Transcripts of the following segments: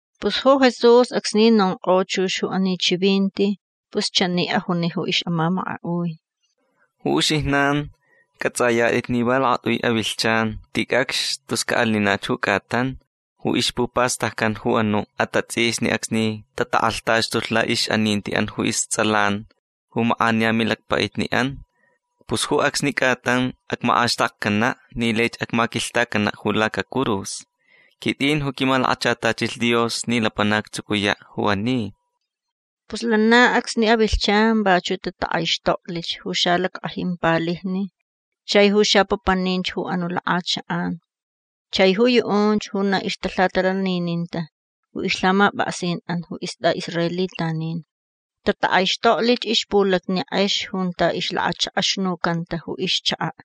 Pus ju Jesús acsni nonkʼo chux ju ani chivinti pus chani ajuni ju ixʼamamakaʼui: ―Ju uxijnan cʼatsʼayatʼit ni va lakatʼui avilhchan ticʼacx tus caʼalinach ju cʼatan ju ixpupastaccan ju anuʼ atatsʼisni acsni tatakʼalhtaxtulh laʼixʼanintiʼan ju istsʼalan ju makʼaniya milacpaʼitniʼan. Pus ju acsni cʼatan acmakʼaxtakcanaʼ ni laich acmaquilhtacanaʼ ju lacacurus. Quitʼin ju quimalakachatachilh Dios ni lapanac actsucuyaʼ ju ani. Pus lana acsni avilhchan vachuʼ tatakʼaixtoklich ju xalackʼajin palijni chai ju xapapaninch ju anuʼ lakʼachakʼan chai ju yuʼunch ju na ixtalhatalanininta ju ixlhamapʼaksinʼan ju istʼaʼisraelitanin. Tatakʼaixtoklich ixpulacni kʼex junta ixlakachakʼaxnucanta ju ixchakaʼ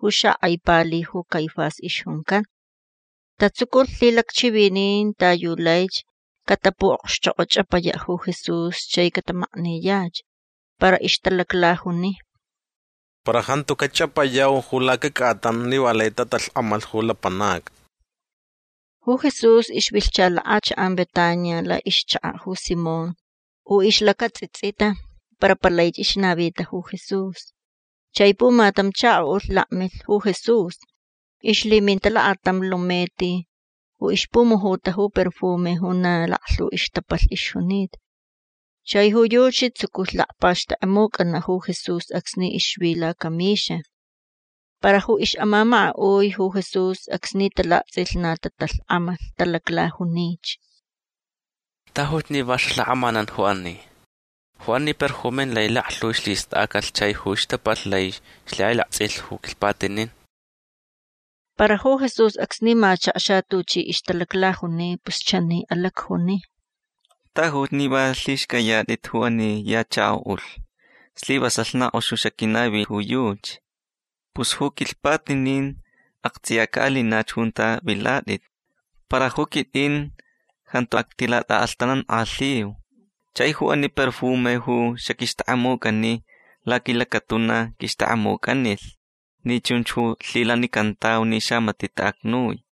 ju xakʼai pali ju Caifás ixjuncan. Tatsuculh lhilacchivinin ta yu laich catapuʼokxchokʼochʼapayaʼ ju Jesús chai catamakniyach. Para ixtalaclajuni: ―Para jantu cachʼapayau ju lacacʼatan ni va lai tatalhkʼamalh ju lapanacni. Ju Jesús ixvilhcha lakʼachakʼan Betania laʼixchakaʼ ju Simón ju ixlacatsʼitsʼita para palaich ixnavita ju Jesús. Chai pumatam chakoʼulh lakmilh ju Jesús. Ixlhiminta lakatam lumeti ju ixpumujuta ju perfume ju na laklhu ixtapalh ixjunita. Chai ju yuchi tsuculh lacpaxtʼekʼemucʼanaʼ ju Jesús acsni ixvi lacamixa. Para ju ixʼamamakaʼui ju Jesús acsni talaktsʼilh na tatalhkʼamalh. Talaclajunich: ―Tajuch ni va xalhakʼamanan ju ani. Ju ani perfume lai laklhu ixlhistʼacalh chai ju ixtapalh laich ixlhikʼailaktsʼilh ju quilhpatinin. Para ju Jesús acsni machakxa tuchi ixtalaclajuni pus chani alacjuni: ―Tajuch ni va lhixcʼayatʼit ju ani ya chakoʼulh. Slivasalh na kʼox ju xaquinavi ju yuchi. Pus ju quilhpatinin aktsʼiya caʼalinach junta vilatʼit. Para ju quitʼin jantu actilatʼaʼalhtanankʼalhiu. Chai ju ani perfume ju xaquixtʼekʼemucʼani laquilacatuna quixtʼekʼemucʼanilh ni chunch ju lhilanicantau ni xamatiʼ taʼacnui.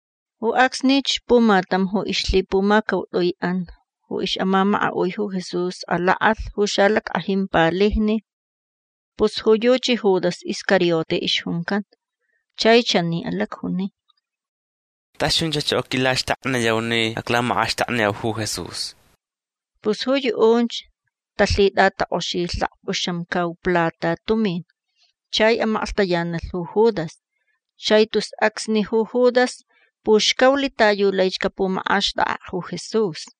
Ju acsnich pumatam ju ixlhipumacautʼuiʼan ju ixʼamamakaʼui ju Jesús alakʼalh ju xalackʼajin palijni. Pus ju yuchi Judas Iscariote ixjuncan. Chai chani alacjuni: ―Tas chunchach ju aquilaxtakniyau ni aclamakʼaxtakniyau ju Jesús. Pus ju yuʼunch talhitʼatakʼoxilh lakpʼuxamcau plata tumin. Chai amaklhtayanalh ju Judas. Chai tus acsni ju Judas puxcaulh ta yu laich capumakʼaxtʼakʼaʼ ju Jesús.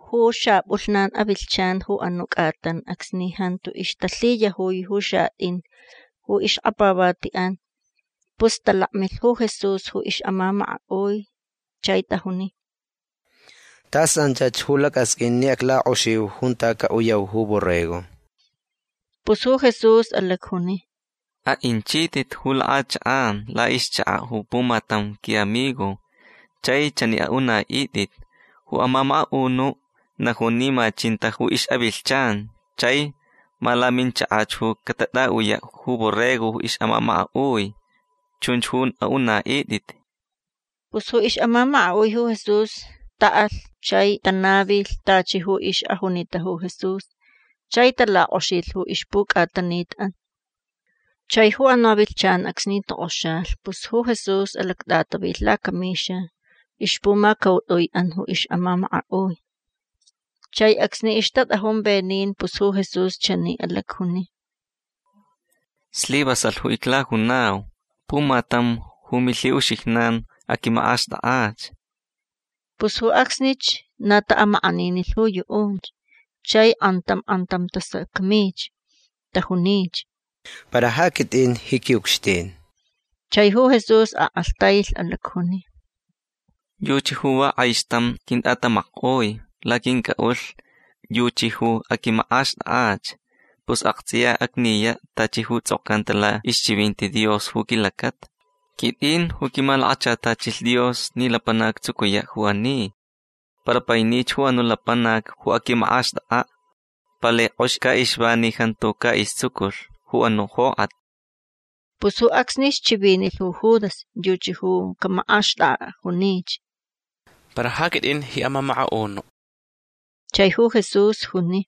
Ju xapʼulhnan avilhchan ju anuʼ cʼatan acsni jantu ixtalhiyajui ju xatʼin ju ixkapavatiʼan pus talakmilh ju Jesús ju ixʼamamakaʼui. Chai tajuni: ―Tas anchach ju lacʼasqʼuin ni aclakʼoxiu junta caʼuyau ju borrego. Pus ju Jesús alacjuni: ―Aʼinchitʼit ju lakʼachakʼan laʼixchakaʼ ju pumatam quiʼamigo. Chai chani aʼunaʼitʼit: “Ju amamakaʼunuʼ najun ni ma chinta ju ixʼavilhchan chai ma laminchakach ju catʼaʼuyaʼ ju borrego ju ixʼamamakaʼui”. Chunch ju aʼunaʼitʼit. Pus ju ixʼamamakaʼui ju Jesús taʼalh chai tanavilh tachi ju ixʼajunita ju Jesús. Chai talakʼoxilh ju ixpucʼatanitʼan. Chai ju anuʼ avilhchan acsni tokʼoxalh pus ju Jesús alactʼatavilh lacamixa ixpumacautʼuiʼan ju ixʼamamakaʼui. Chai acsni ixtatʼajun venin pus ju Jesús chani alacjuni: ―Slivasalh ju iclajunau. Pumatam ju milhiʼuxijnan aquimakʼaxtʼakʼach. Pus ju acsnich na taʼamakʼaninilh ju yuʼunch. Chai kʼantam kʼantam tasacmich. Tajunich: ―Para ja quitʼin ji quiʼucxtin. Chai ju Jesús akʼalhtailh. Alacjuni: ―Yuchi ju va kʼaixtam quintʼatamackʼoi laquincʼaʼulh. Yuchi ju aquimakʼaxtʼakʼach. Pus aktsʼiya acniyaʼ tachi ju tsʼokcanta laʼixchivinti Dios ju quilacata. Quitʼin ju quimalakachatachilh Dios ni lapanac actsucuyaʼ ju ani. Para painich ju anuʼ lapanac ju aquimakʼaxtʼakʼaʼ. Palai kʼox caʼixva ni jantu caʼistsuculh ju anuʼ jokʼat. Pus ju acsnich chivinilh ju Judas. Yuchi ju camakʼaxtʼakʼaʼ. Junich: ―Para ja quitʼin ji amamakaʼunuʼ. Chai ju Jesús juni: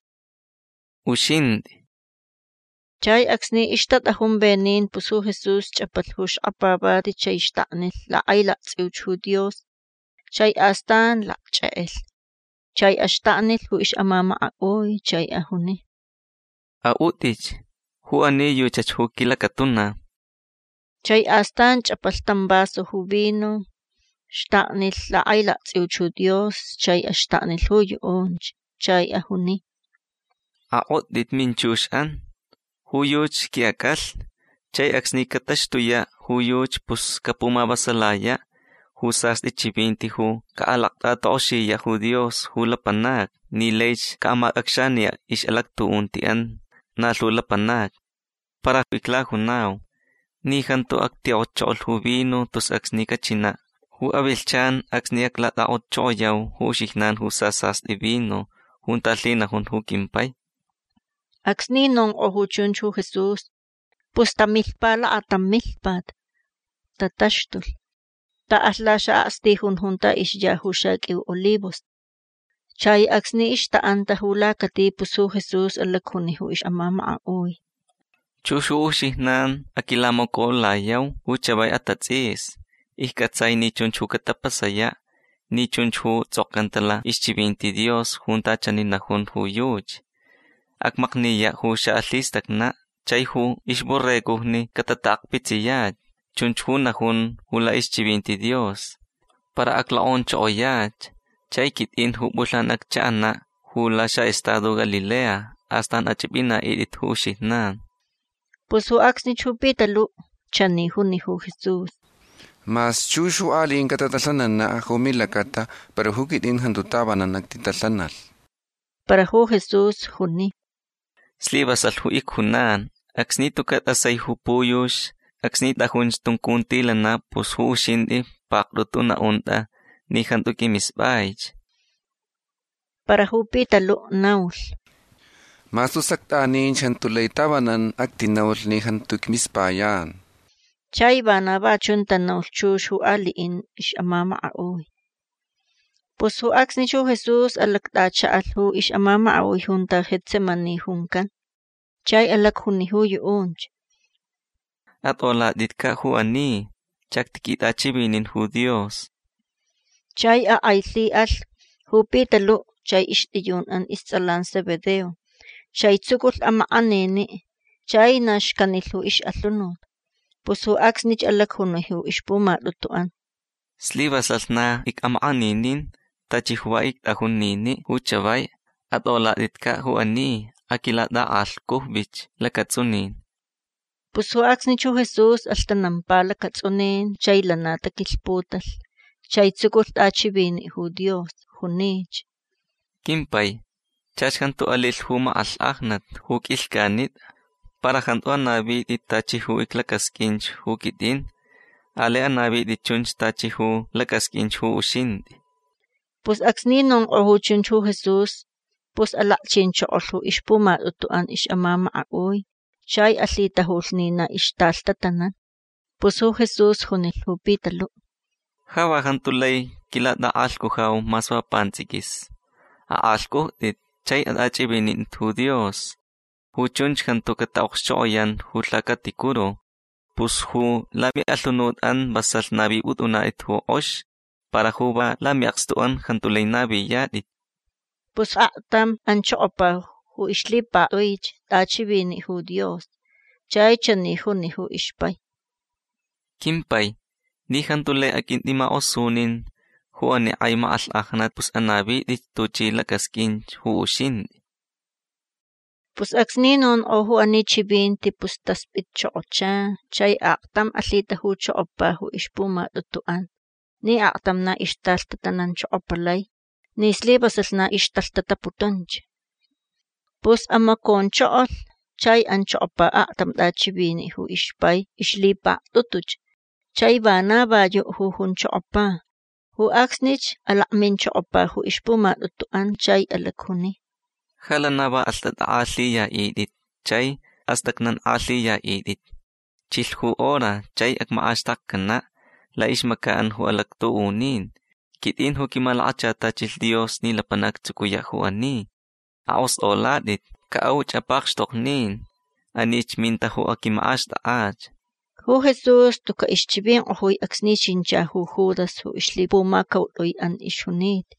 ―Uxintʼi. Chai acsni ixtatʼajun venin pus ju Jesús chʼapalh ju xkapavati chai xtaknilh lakʼailaktsʼiuch ju Dios. Chai astan lacchʼekʼelh. Chai axtaknilh ju ixʼamamakaʼui. Chai ajuni: ―Aʼutʼitch. Ju ani yuchach ju quilacatuna. Chai astan chʼapalh tam vaso ju vino. Xtaknilh lakʼailaktsʼiuch ju Dios. Chai axtaknilh ju yuʼunch. Chai ajuni: ―Akʼotʼit minchuxʼan. Ju yuchi quiʼacʼalhni. Chai acsni cataxtuyaʼ ju yuchi pus capumavasalayaʼ ju sastʼi chivinti ju caʼalactʼatakʼoxiyaʼ ju Dios ju lapanacni ni laich caʼamacʼacxaniyaʼ ixʼalactuʼuntiʼan na lhu lapanacni. Para iclajunau ni jantu actikʼotchokolh ju vino tus acsni cachinaʼ ju avilhchan acsni aclatʼakʼotchokoyau ju uxijnan ju sasastʼi vino junta lhinajun ju quimpai. Acsni nonkʼo ju chunch ju Jesús pus tamilhpa lakatam milhpat. Tataxtulh. Taʼalh laxaʼakstijun junta ixya ju xaqʼuiu olivos. Chai acsni ixtaʼanta ju lacati pus ju Jesús alacjuni ju ixʼamamakaʼui: ―Chux ju uxijnan aquilamacoʼulayau ju chavai atatsʼisni. Iccʼatsai ni chunch ju catapasayaʼ ni chunch ju tsʼokcanta laʼixchivinti Dios junta chani najun ju yuchi: “Acmakniyaʼ ju xaʼalhistacnaʼ chai ju ixborregojni catataʼakpitsiyach”. Chunch ju najun laʼixchivinti Dios. Para aclokʼonchokoyach chai quitʼin ju pʼulhnan acchaʼanaʼ ju laxaʼestado Galilea. Astan achʼipʼinaʼitʼit ju uxijnan. Pus ju acsnich ju Pitaluʼ chani juni ju Jesús: ―Mas chux ju aliʼin catatalhananaʼ ju milacata para ju quitʼin jantu tavanan actitalhanalh. Para ju Jesús juni: ―Slivasalh ju icjunan. Acsni tucaʼ tʼasai ju puyux acsni tʼajunch tuncuntilanaʼ pus ju uxintʼi paktʼutu naʼuntʼa ni jantu qʼuimispʼaich. Para ju Pitaluʼ naulh: ―Mas tus actʼaninch jantu lai tavanan actinaulh ni jantu icmispayan. Chai vana va chun tanaulh chux ju aliʼin ixʼamamakaʼui. Pus ju acsnich ju Jesús alactʼachaʼalh ju ixʼamamakaʼui junta Getsemaní juncan. Chai alacjuni ju yuʼunch: ―Atʼolatʼitcaʼ ju ani. Chactiquitʼachivinin ju Dios. Chai akʼailhiʼalh ju Pitaluʼ chai ixtʼiyunʼan istsʼalan Zebedeo. Chai tsuculh amakʼaniniʼ chai na xcanilh ju ixʼalhunut. Pus ju acsnich alacjuni ju ixpumatʼutuʼan: ―Slivasalh na icʼamakʼaninin. Tachi ju va ictʼajun niniʼ ju chavai. Atʼolatʼitcaʼ ju ani. Aquilatʼakʼalhcujvich lacatsʼunin. Pus ju acsnich ju Jesús alhtanampa lacatsʼunin. Chai lana taquilhputalh chai tsuculh tʼachiviniʼ ju Dios. Junich: ―Quimpai chach jantu alilh ju makʼalhkʼajnat ju qʼuilhcʼanitʼa. Para jantu anavitʼi tachi ju iclacasqʼuinch ju quitʼin. Alai anavitʼi chunch tachi ju lacʼasqʼuinch ju uxintʼi. Pus acsni nonkʼo ju chunch ju Jesús pus alakchinchokolh ju ixpumatʼutuʼan ixʼamamakaʼui. Chai alhitajulh ni na ixtalhtatanan. Pus ju Jesús junilh ju Pitaluʼ: ―Ja va jantu lai quilatʼakʼalhcujau mas va pantsʼiquis. Akʼalhcʼujtʼit chai atʼachʼivinintʼit ju Dios. Ju chunch jantu cataʼokxchokʼoyan ju lhacaticuru. Pus ju lamiʼalhunutʼan vasalh navipʼutʼunatʼit ju kʼox. Para ju va lamiʼakstuʼan jantu lai naviyatʼit. Pus aktam anchokopa ju ixlhipaktʼuich tʼachiviniʼ ju Dios. Chai chani juni ju ixpai: ―Quimpai ni jantu lai aqʼuintʼimakʼosunin ju ani kʼai makʼalhkʼajnat pus anavitʼich tuchʼi lacʼasqʼuin ju uxintʼi. Pus acsni nonkʼo ju ani chivinti pus taspʼitchokocha chai aktam alhitajuchokopa ju ixpumatʼutuʼan ni aktam na ixtalhtatananchokopalai ni slivasalh na ixtalhtataputunch. Pus amaconchokolh chai anchokopa aktam tʼachiviniʼ ju ixpai ixlhipaktʼutuch. Chai vana va yuʼ ju junchokopa. Ju acsnich alakminchokopa ju ixpumatʼutuʼan chai alacjuni: ―Ja lana va alhtʼatʼakʼalhiyaʼitʼit chai astʼacnankʼalhiyaʼitʼit. Chilh ju hora chai acmakʼaxtakcanaʼ laʼixmacaʼan ju alactuʼunin. Quitʼin ju quimalakachatachilh Dios ni lapanac actsucuyaʼ ju ani. Akʼostʼolatʼit. Caʼauch apakxtoknin. Anich minta ju aquimakʼaxtʼakʼach. Ju Jesús tucaʼ ixchivinkʼojui acsni chincha ju Judas ju ixlhipumacautʼuiʼan ixjunita.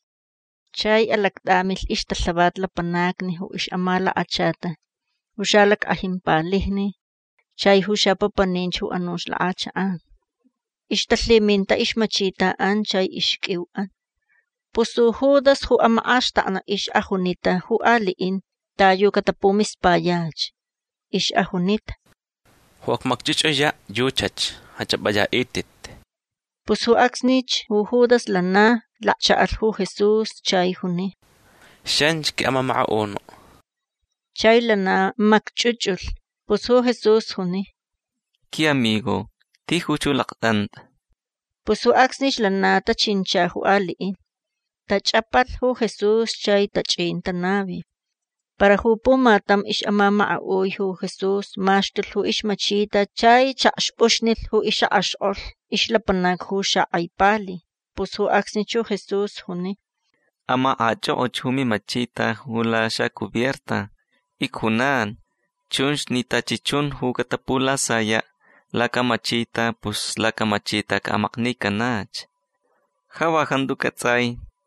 Chai alactʼamilh ixtalhavat lapanacni ju ixʼamalakachata ju xalackʼajin palijni chai ju xapapaninch ju anuch lakʼachakʼan. Ixtalhiminta ixmachitaʼan chai ixqʼuiuʼan. Pus ju Judas ju amakʼaxtaknaʼ ixʼajunita ju aliʼin ta yu catapumispayach. Ixʼajunita: ―Ju acmacchʼuchʼuyach yuchach. Achʼapʼayaʼitʼit. Pus ju acsnich ju Judas lana lakchaʼalh ju Jesús chai juni: ―Xanchi quiʼamamakaʼunuʼ. Chai lana macchʼuchʼulh. Pus ju Jesús juni: ―Quiʼamigo tijuch ju laktʼantʼa. Pus ju acsnich lana tachincha ju aliʼin. Tachʼapalh ju Jesús chai tachʼin tanavi. Para ju pumatam ixʼamamakaʼui ju Jesús maxtulh ju ixmachita chai chakxpʼuxnilh ju ixʼakʼaxkʼolh ixlapanac ju xakʼai pali. Pus ju acsnich ju Jesús juni: ―Amakʼachʼokʼoch ju mimachita laxapajina. Icjunan chunch ni tachi chun ju catapulasayaʼ lacamachita pus lacamachita caʼamaknicanach. Ja va jantu cʼatsʼai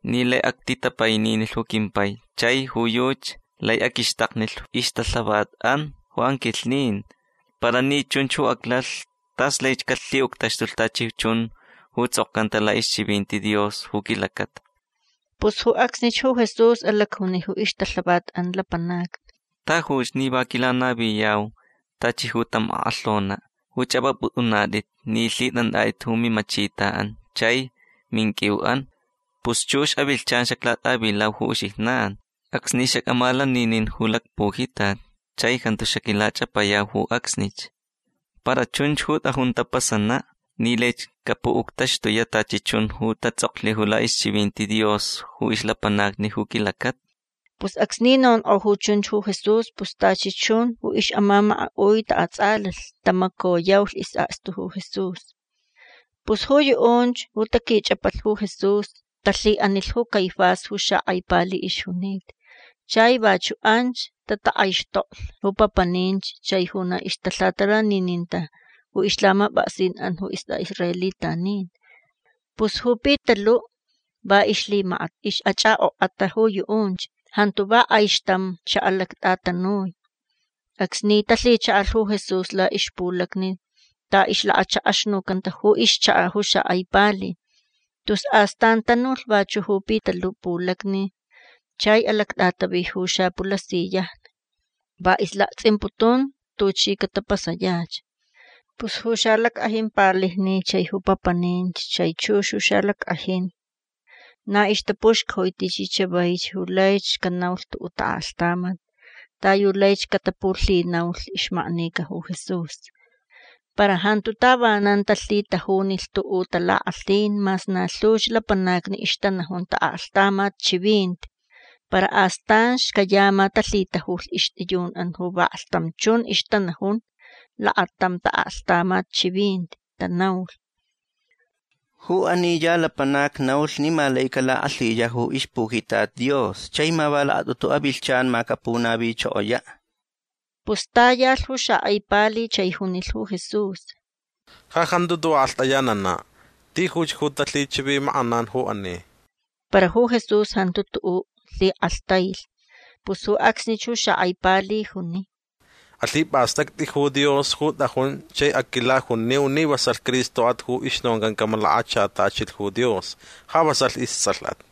ni lai actitapaininilh ju quimpai chai ju yuchi lai aquixtaknilh ixtalhavatʼan ju anquilhnin. Para ni chunch ju aclalh tas laich calhiʼuctaxtulh tachi chun ju tsʼokcanta laʼixchivinti Dios ju quilacata. Pus ju acsnich ju Jesús alacjuni ju ixtalhavatʼan lapanacni: ―Tajuch ni va quilanaviyau tachi ju tam akʼalhonaʼ ju chʼapʼapʼutʼunatʼit ni lhitʼantʼatʼit ju mimachitaʼan chai ju minqʼuiuʼan. Pus chux avilhchan xaclatʼavilau ju uxijnan acsni xacʼamalaninin ju lacpujitat chai jantu xaquilachʼapayau ju acsnich. Para chunch ju tʼajun tapasanaʼ ni laich capuʼuctaxtuyaʼ tachi chun ju tatsʼoklh laʼixchivinti Dios ju ixlapanacni ju quilacata. Pus acsni nonkʼo ju chunch ju Jesús pus tachi chun ju ixʼamamakaʼui taʼatsʼalalh. Tamacoyaulh isʼakstu ju Jesús. Pus ju yuʼunch ju taquichʼapalh ju Jesús talhiʼanilh ju Caifás ju xakʼai pali ixjunita. Chai vachuʼ anch tatakʼaixtoklh ju papaninch chai ju na ixtalhatalanininta ju ixlhamapʼaksinʼan ju istʼaʼisraelitanin. Pus ju Pitaluʼ va ixlhimakat ixʼachʼakʼokʼata ju yuʼunch. Jantu va kʼaixtam xaʼalactʼatanui acsni talhichaʼalh ju Jesús laʼixpulacni ta ixlakachakʼaxnucanta ju ixchakaʼ ju xakʼai pali. Tus astan tanulh vachuʼ ju Pitaluʼ pulacni chai alactʼatavi ju xapulasiyajni. Va ixlaktsʼimputun tuchi catapasayach. Pus ju xalackʼajin palijni chai ju papaninch chai chux ju xalackʼajin na ixtapuxcajui tichi chavaich ju laich canaulh tuʼuʼ taʼaklhtamat ta yu laich catapulhinaulh ixmaknica ju Jesús. Para jantu tavanan talhitajunilh tuʼuʼ talakʼalhin mas na lhuch lapanacni ixtanajun taʼaklhtamat chivinti. Para astan xcayama talhitajulh ixtʼiyunʼan ju vaklhtam chun ixtanajun lakatam taʼaklhtamat chivinti. Tanaulh: ―Ju ani ya lapanac naulh ni ma lai calakʼalhiyaʼ ju ixpujitat Dios chai ma va lakatʼutu avilhchan ma capunavichokoyaʼ. Pus tayalh ju xakʼai pali chai junilh ju Jesús: ―Ja jantu tuʼuʼ akʼalhtʼayananaʼ. Tijuch ju talhichivimakʼanan ju ani. Para ju Jesús jantu tuʼuʼ lhikʼalhtailh. Pus ju acsnich ju xakʼai pali juni: ―Alhipʼastʼactʼi ju Dios ju tʼajun chai aquilajuniu ni vasalh Cristoʼat ju ixnoncan camalakachatachilh ju Dios. Ja vasalh istsʼalhʼat.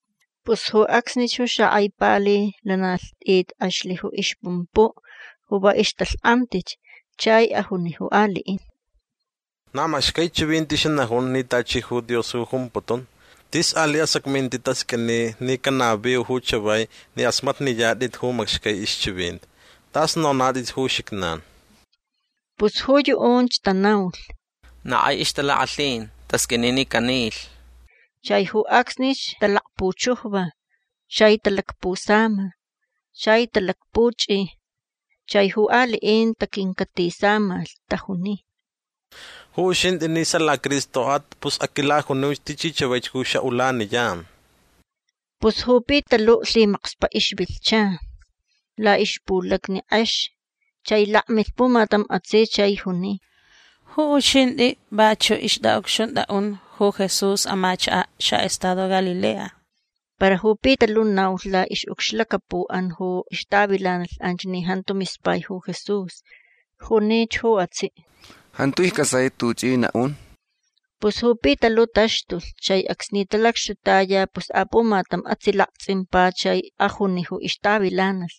Pus ju acsnich ju xakʼai pali lana lhtʼit kʼexlh ju ixpumpuʼ ju va ixtalhkʼamtich. Chai ajuni ju aliʼin: ―Na macxcai chivinti xanajun ni tachi ju Dios ju jumputun. Tis aliʼ asacminti tasqʼuini ni canaviu ju chavai ni kʼasmatniyatʼit ju macxcai ixchivinti. Tʼas nonatʼit ju uxijnan. Pus ju yuʼunch tanaulh: ―Na kaʼi ixtalakʼalhin. Tasqʼuini ni canilh. Chai ju acsnich talacpuchujva. Chai talacpusama. Chai talakpuchʼi. Chai ju aliʼin taquincatisamalh. Tajuni: ―Ju uxintʼi ni sala Cristoʼat pus aquilajuniuch tichi chavaich ju xaʼulaniyan. Pus ju Pitaluʼ lhimakspaʼ ixvilhcha. Laʼixpulacni kʼex. Chai lakmilh pumatam atsiʼ chai juni: ―Ju uxintʼi vachuʼ ixtʼaʼucxuntʼaʼun ju Jesús amachakaʼ xaʼestado Galilea. Para ju Pitaluʼ naulh laʼixʼucxlacapuʼan ju ixtavilanalh anch ni jantu mispai ju Jesús. Junich ju atsiʼ: ―Jantu iccʼatsai tuchʼi naʼun. Pus ju Pitaluʼ taxtulh. Chai acsni talacxtutaya pus apumatam atsiʼ laktsʼimpa chai ajuni ju ixtavilanalh: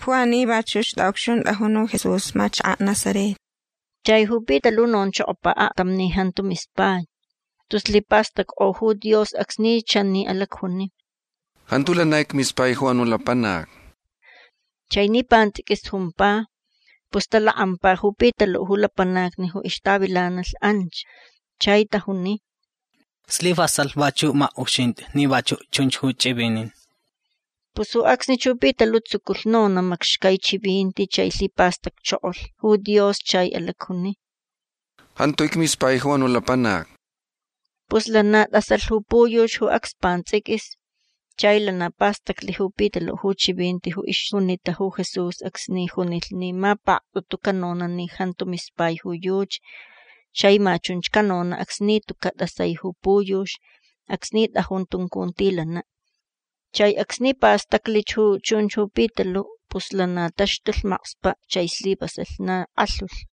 ―Ju ani vachuʼ ixtʼaʼucxuntʼajun ju Jesús amachakaʼ Nazaret. Chai ju Pitaluʼ nonchokopa aktam ni jantu mispai. Tus lhipastackʼo ju Dios acsni chani alacjuni: ―Jantu lana icmispai ju anuʼ lapanac. Chai ni pantsʼiquis jumpa pus talakʼampa ju Pitaluʼ ju lapanacni ju ixtavilanalh anch. Chai tajuni: ―Slivasalh vachuʼ makʼuxintʼi ni vachuʼ chunch ju chʼivinin. Pus ju acsnich ju Pitaluʼ tsuculh nonaʼ macxcai chivinti chai lhipastacchokolh ju Dios chai alacjuni: ―Jantu icmispai ju anuʼ lapanac. Pus lana tʼasalh ju puyux ju acs pantsʼiquis. Chai lana pastaclh ju Pitaluʼ ju chivinti ju ixjunita ju Jesús acsni junilh ni ma paktʼutu canonaʼ ni jantu mispai ju yuchi. Chai ma chunch canonaʼ acsni tucaʼ tʼasai ju puyux acsni tʼajun tuncuntilanaʼ. Chai acsni pastaclich ju chunch ju Pitaluʼ pus lana taxtulh makspaʼ. Chai slivasalh na kʼalhulh.